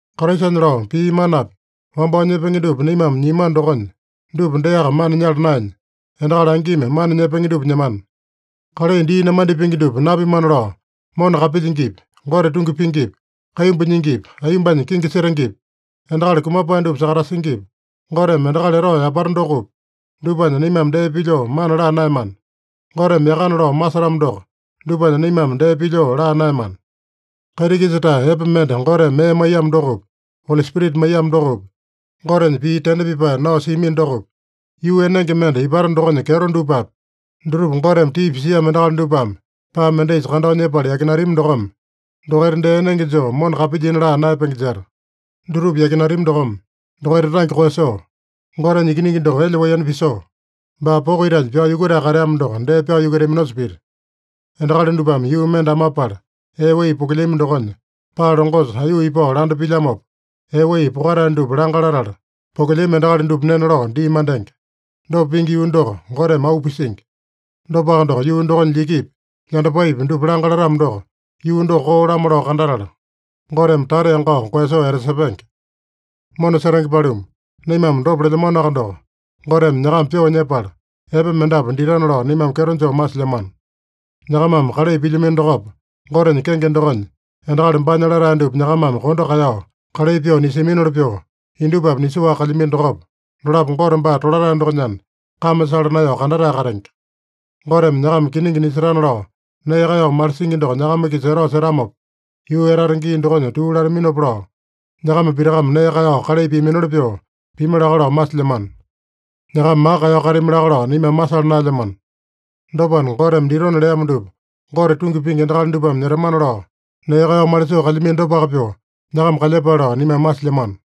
Kraisanya lao pii manapi wambao nyepenge dupa naimame nyiamano dokonya, dupa deaka mana nyala naenya, endakali angimi mana nyepenge dupa nyemana. Kalai dii namandipenge dupa napimana lao mona kapilyingipi, Gote tungi pingipi, kaimbu nyingipi, aiyombanya kingi setengepi, endakali kumapae dupa sakatasingipi, Goteme endakali etao yapata dokopi, dupanya naimame dee pilyoo mana laa naeyamana. Goteme yakana lao masetamo doko, dupanya naimame dee pilyoo laa naeyamana. Kaiti-kisa-tae epe mende Goteme mee maiyamo dokopi, Oli Spirita maiyamo dokopi, Gotenya pii tende pipae nao siamino dokopi, yuu enenge mende ipata dokonya kyeto dupapi, dutupa Goteme tii pisiamo endakali dupame paa mendaisa kandao nyepala yakinatami dokome, dokaita dee enenge joo mona kapilyina laa naeyapenge jeta. Dutupa yakinatami dokome, dokaita tange koeyasoo, Gotenya Ikiningi doko elya-waiyono pisoo, baa poko itanya pyao yukutae kateamo doko dee pyao yukutaminosa pita. Endakali dupame yuu mende amapala ee wai pokelyami dokonya, paa longosa aiyuu ipao landa pilyamopa, ee wai pokatae dupa langa latala, pokelyami endakali dupa nena lao dii mandenge. Dopa pingi yuu doko Goteme auu pisingi. Dopaka doko, yuu dokonya lyikipi, lyandapaipi dupa langa latamo doko, yuu doko koo-lamo lao kandatala, Goteme tata yangao koeyasoo etasepenge. Mona setenge paluma, naimame dopa lelyamanoaka doko, Goteme nyakama pyoo nyepala, epe mendapu ditana lao naimame kyeto joo masilyamano. Nyakamame kalai pilyamino dokopa, Gotenya kenge dokonya endakali baanya latae dupa nyakamame kondo kaeyao kalai pyoo nisiaminoli pyoo, indupapi nisoaka kalyamino dokopa, dolapo Gote baa tolatae dokonyana, kame sala naeyao kandatae katenge. Goteme nyakama kiningi nisetana lao nee kaeyao malisingi doko nyakama-kisa etao setamopa, yuu etata gii dokonya tuu lataminopa lao, nyakama pitakame nee kaeyao kalai piaminoli pyoo pimi laka lao masilyamano. Nyakama maka kaeyao katami laka lao naimame masala naelyamano. Dopana, Goteme ditona leamo dupa Gote tungi pingi endakali dupame nyetamana lao nee kaeyao malisoo kalyamino dopaka pyoo, nyakama kalyepale lao naimame masilyamano.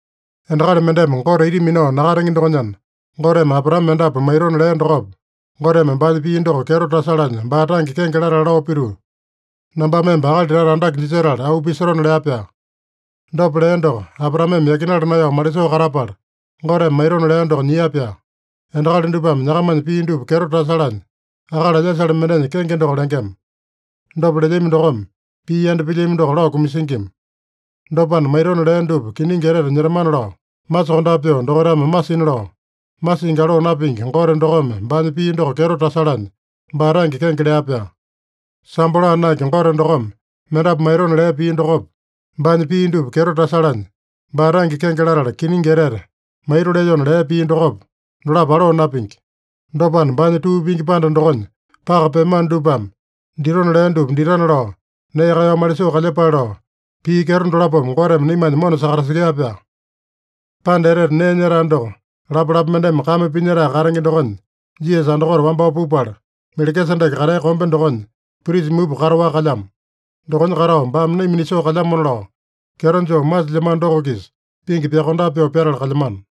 Endakali mendeme Gote ita minao nakatenge dokonyana, Goteme Abraame mendapu maitona lea dokopa, Goteme baanya pii doko kyeto tasalanya baa tange kenge latala lao pituu, “Nambame emba akali tata andake jisetala auu pisotona” lea-pyaa. Dopa lea doko, Abraameme yakinala naeyao malisoo katapala, Goteme maitona lea doko nyia-pyaa. Endakali dupame nyakamanya pii dupa kyeto tasalanya, akali alyasale mendenya kenge doko lengema. Dopa lelyami dokome, pii yanda pilyami doko lao kumasingima. Dopana, maitona lea dupa kiningi etete nyetamana lao masokondape pyoo dokaitame masina lao, masingi aloo napingi Gote dokome baanya pii doko kyeto tasalanya, baa tange kenge lea-pyaa. Sambo laa naenge Gote dokome mendapu maitona lea pii dokopa, baanya pii dupa kyeto tasalanya baa tange kenge latala kiningi etete maito lelyona lea pii dokopa, dolapo aloo napingi. Dopana, baanya tuu pingi panda dokonya paka peamano dupame ditona lea dupa ditana lao nee kaeyao malisoo kalyepale lao, pii kyeto dolapome Goteme naimanya mona sakatasekea-pyaa. Panda Etete Nee Nyetae doko lapalapa mendeme kame pinyetae katenge dokonya Jisasa andakote wambao pupala, Melekisedeke katea kombe dokonya prisa mupa kataowaka kalyamo. Dokonya katao, baame naima nisoo kalyamona lao, kyeto joo masilyamano doko-kisa pingi pyakondape pyoo pyatala kalyamano.